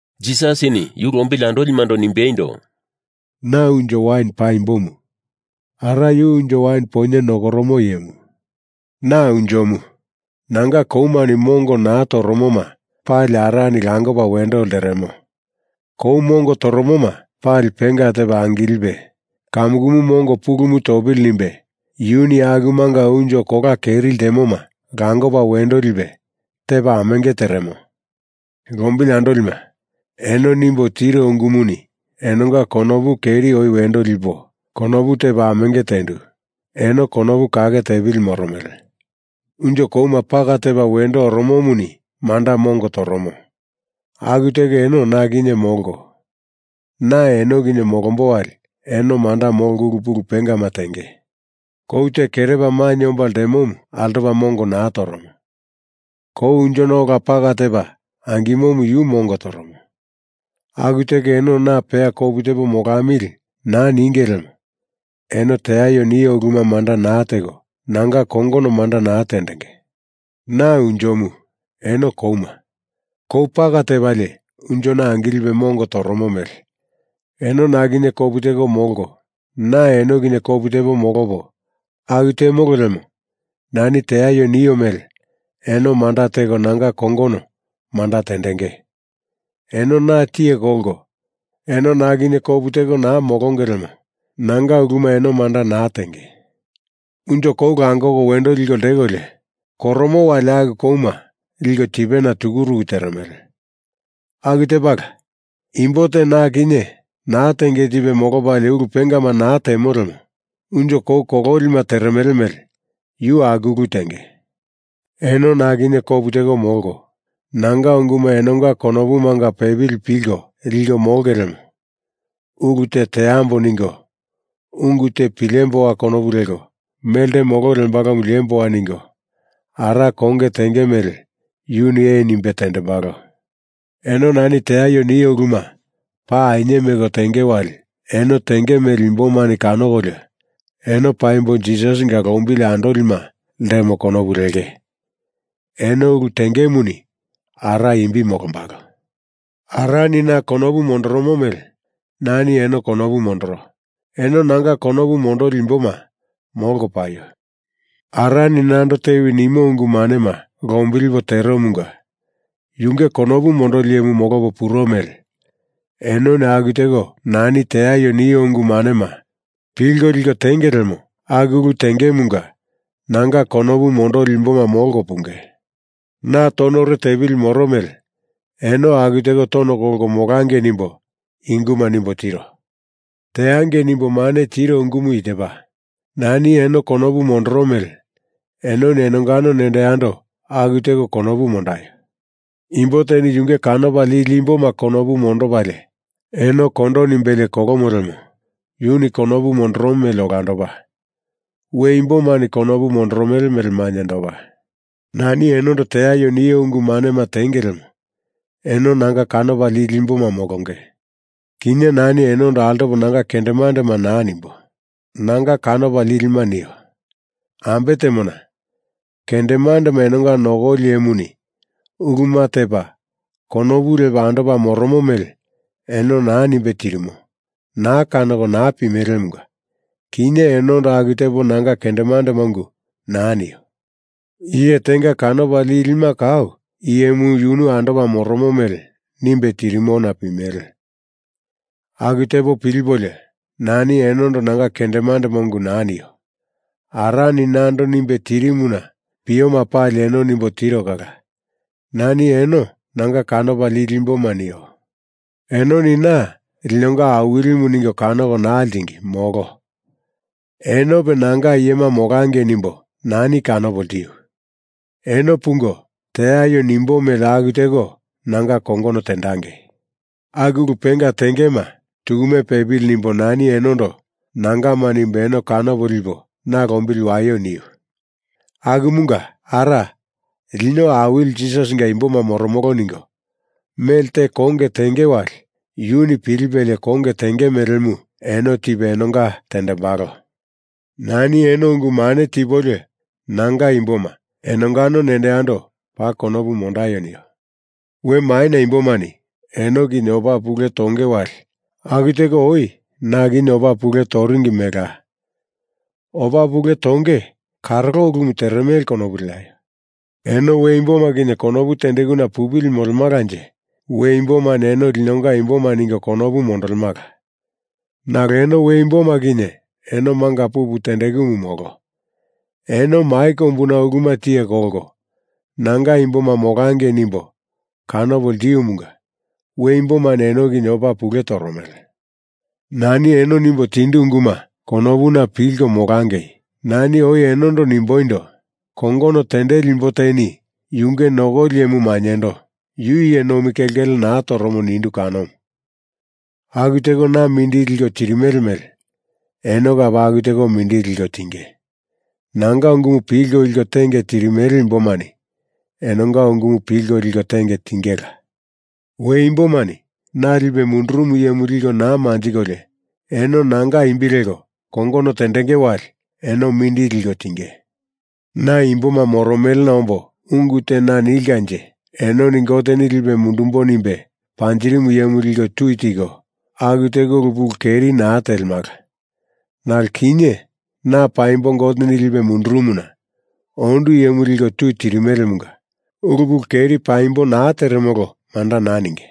Jisasini yu lombili andolimando nimbeindo, “Na unjo wain paimbomu. Ara yu unjo wain poinye nokoromu iyemu. Na Unjomu. Nanga koumani mongo naa toromoma pali Arani langopa wendo lteremo. Kou mongo toromoma pali penga tepa angilipe kamukumu mongo pulumu topili nimbe yuni akumanga unjo kola keri ltemoma langopa wendo lipe tepa amenge teremo. Lombili andolima, eno nimbo tiro ungumuni enonga konopu keri oi wendo lipo konopu tepo amenge tendu, eno konopu kake tepili moromele. Unjo kouma paka tepa wendo oromomuni manda mongo toromo, aku teko eno na kinye molko, na eno kinye molombo wali eno manda molko ulu pulu pengama tenge. Kou te kerepa mainye omba ltemomu altopa mongo naa toromo. Kou unjona ola paka tepa angimomu yu mongo toromo. Aku teko eno na peya kopu tepo molamili naa ninge lemo eno teaio nio uluma manda naa teko nanga kongono manda naa tendenge. Na unjomu, eno kouma. Kou paka tepalie unjona angilipe mongo toromo mele eno na kinye kopu teko molko na eno kinye kopu tepo molopo aku temolo lemo nani teaio nio mele eno manda teko nanga kongono manda tendenge. Eno na tiye kolko eno na kinye kopu teko naa molonge lemo nanga uluma eno manda naa tenge. Unjo kou langoko wendo liko ltekolio, koromo wali aku kouma liko tipena tukuruku teremele. Aku tepala, imbo te na kinye naa tenge tipe molopalie ulu pengama naa temo lemo unjo kou kololima teremele mele yu aku ulu tenge. Eno na kinye kapu teko molko nanga unguma enonga konopumanga pepili pilko liko molonge lemo ulu te teamboa ningo, ungu te pilemboa konopu leko, melte molo lembalomu liemboa ningo, Ara konge tenge mele yuni ee nimbe tendembalo. Eno nani teaio nio uluma paa ainye meko tenge wali eno tenge mele imbomani kanokolio eno paimbo Jisasinga lombili andolima ltemo konopu lenge. Eno ulu tengemuni Ara imbi molombalo.” “Arani na konopu mondoromo mele nani eno konopu mondoro. Eno nanga konopu mondoli imboma molko paio! Arani nando tewi nimo ungu manema lombilipo teromunga yunge konopu mondoli iyemu molopo puro mele enoni aku teko nani teaio nio ungu manema pilko liko tenge lemo aku ulu tengemunga nanga konopu mondoli imboma molko punge. Na tonore tepili moro mele eno aku teko tono kolko molangei nimbo i unguma nimbo tiro. Teangei nimbo mane tiro ungumu i tepa: Nani eno konopu mondoro mele enoni enongano nendo yando aku teko konopu mondaio. Imbo teni yunge kanopa lili imboma konopu mondopalie eno kolo nimbelie kolomo lemo yuni konopu mondoromo mele olandopa, we imbomani konopu mondoromele mele mainyendopa. Nani enondo teaio nio ungu manema tenge lemo eno nanga kanopa lili imboma molonge. Kinye nani enondo altopo nanga kendemandema naa nimbo, nanga kanopa lilima nio. Ambe temona, kendemandema enonga nokoli iyemuni uluma tepa konopu lepa andopa moromo mele eno naa nimbe tirimo naa kanoko naa pimelemunga kinye enondo aku tepo nanga kendemandema ungu naa nio. Iye tenga kanopa lilima kau iyemu yu andopa moromo mele nimbe tirimona pimele. Aku tepa pilipolio nani enondo nanga kendemandema ungu naa nio. Arani nando nimbe tirimuna pioma pali eno nimbo tiro kala nani eno nanga kanopa lili imboma nio. Enoni na linonga Awilimu ningo kanoko naa ltingi, molo. Enope nanga iyema molangei nimbo nani kanopo ltiu. Eno pungo, teaio nimbo mele aku teko nanga kongono tendangei! Aku ulu penga tengeima tukume pepili nimbo nani enondo nangama nimbo eno kanopo lipo na lombili waio niu. Akumunga Ara lino Awili Jisasinga imboma moromolo ningo mele te konge tenge wali yuni pilipelie konge tenge melemu eno tipe enonga tendembalo. Nani eno ungu mane tipolio nanga imboma enongano nendo yando paa konopu mondaio nio.” “We maina imbomani eno kinye opa pule tonge wali aku teko oi na kinye opa pule toringi melela. Opa pule tonge karolo ulumu teremele konopu leaio. Eno we imboma kinye konopu tendekuna pupili molemalanje we imbomani eno linonga imboma ningo konopu mondolemala. Nalo eno we imboma kinye eno manga pupu tendekumu molo. Eno mai kombuna uluma tiye kolko nanga imboma molangei nimbo kanopo ltiumunga we imbomani eno kinye opa pule toromele. Nani eno nimbo tindu unguma konopuna pilko molangei! Nani oi enondo nimboindo, kongono tendeli imbo teni yunge nokoli iyemu mainyendo, yu iye nomi kelkele naa toromo nindu kanomu. Aku teko na mindili liko tirimele mele eno kape aku teko mindili liko tinge. Nanga ungumu pilko liko tenge tirimele imbomani enonga ungumu pilko liko tenge tingela. We imbomani Na Lipe Mundurumu Iyemu liko naa manjikolio, eno nanga imbi leko kongono tendenge wali eno mindili liko tinge. Na imboma moromelena ombo ungu te naa nilkanje enoni Goteni lipo mundumbo nimbe panjirimu iyemu liko tui tiko, aku teko ulu pulu keri naa telemala. Nalo kinye na paimbo Goteni lipe mundurumuna ondu iyemu liko tui tirimelemunga ulu pulu keri paimbo naa teremolo manda naa ninge.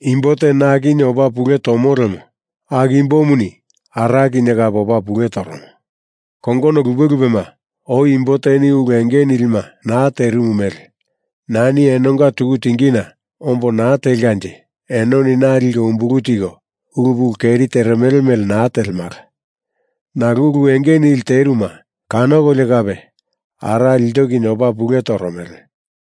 Imbo te na kinye opa pule tomo lemo aku imbomuni Ara kinye kape opa pule toromo. Kongono lupe lupema, oi imbo teni ulu enge nilima naa terimu mele nani enonga tuku tingina ombo naa telkanje enoni na liko umbulu tiko ulu pulu keri teremele mele naa telemala. Nalo ulu enge nili teruma kanokolio kape Ara ilto kinye opa pule toromele.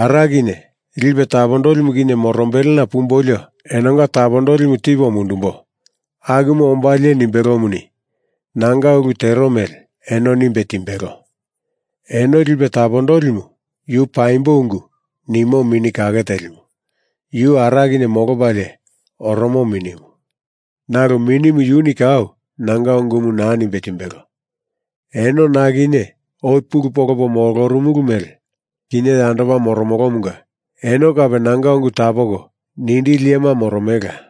Ara kinye Lipe Tapondolimu kinye morombelena pumbolio enonga tapopilimu tipo mundumbo akumu ombalie nimbelomuni, nanga ulu tero mele eno nimbe timbelo. Eno Lipe Tapondolimu yu Paimbo Ungu Nimo Mini Kake Telimu, yu Ara kinye molopalie oromo Minimu. Nalo Minimu yuni kau nanga ungumu naa nimbe timbelo. Eno na kinye oi pulu polopo molorumulu mele kinye yandopa moromolomunga eno kape nanga ungu tapoko nindili iyema moromelela.”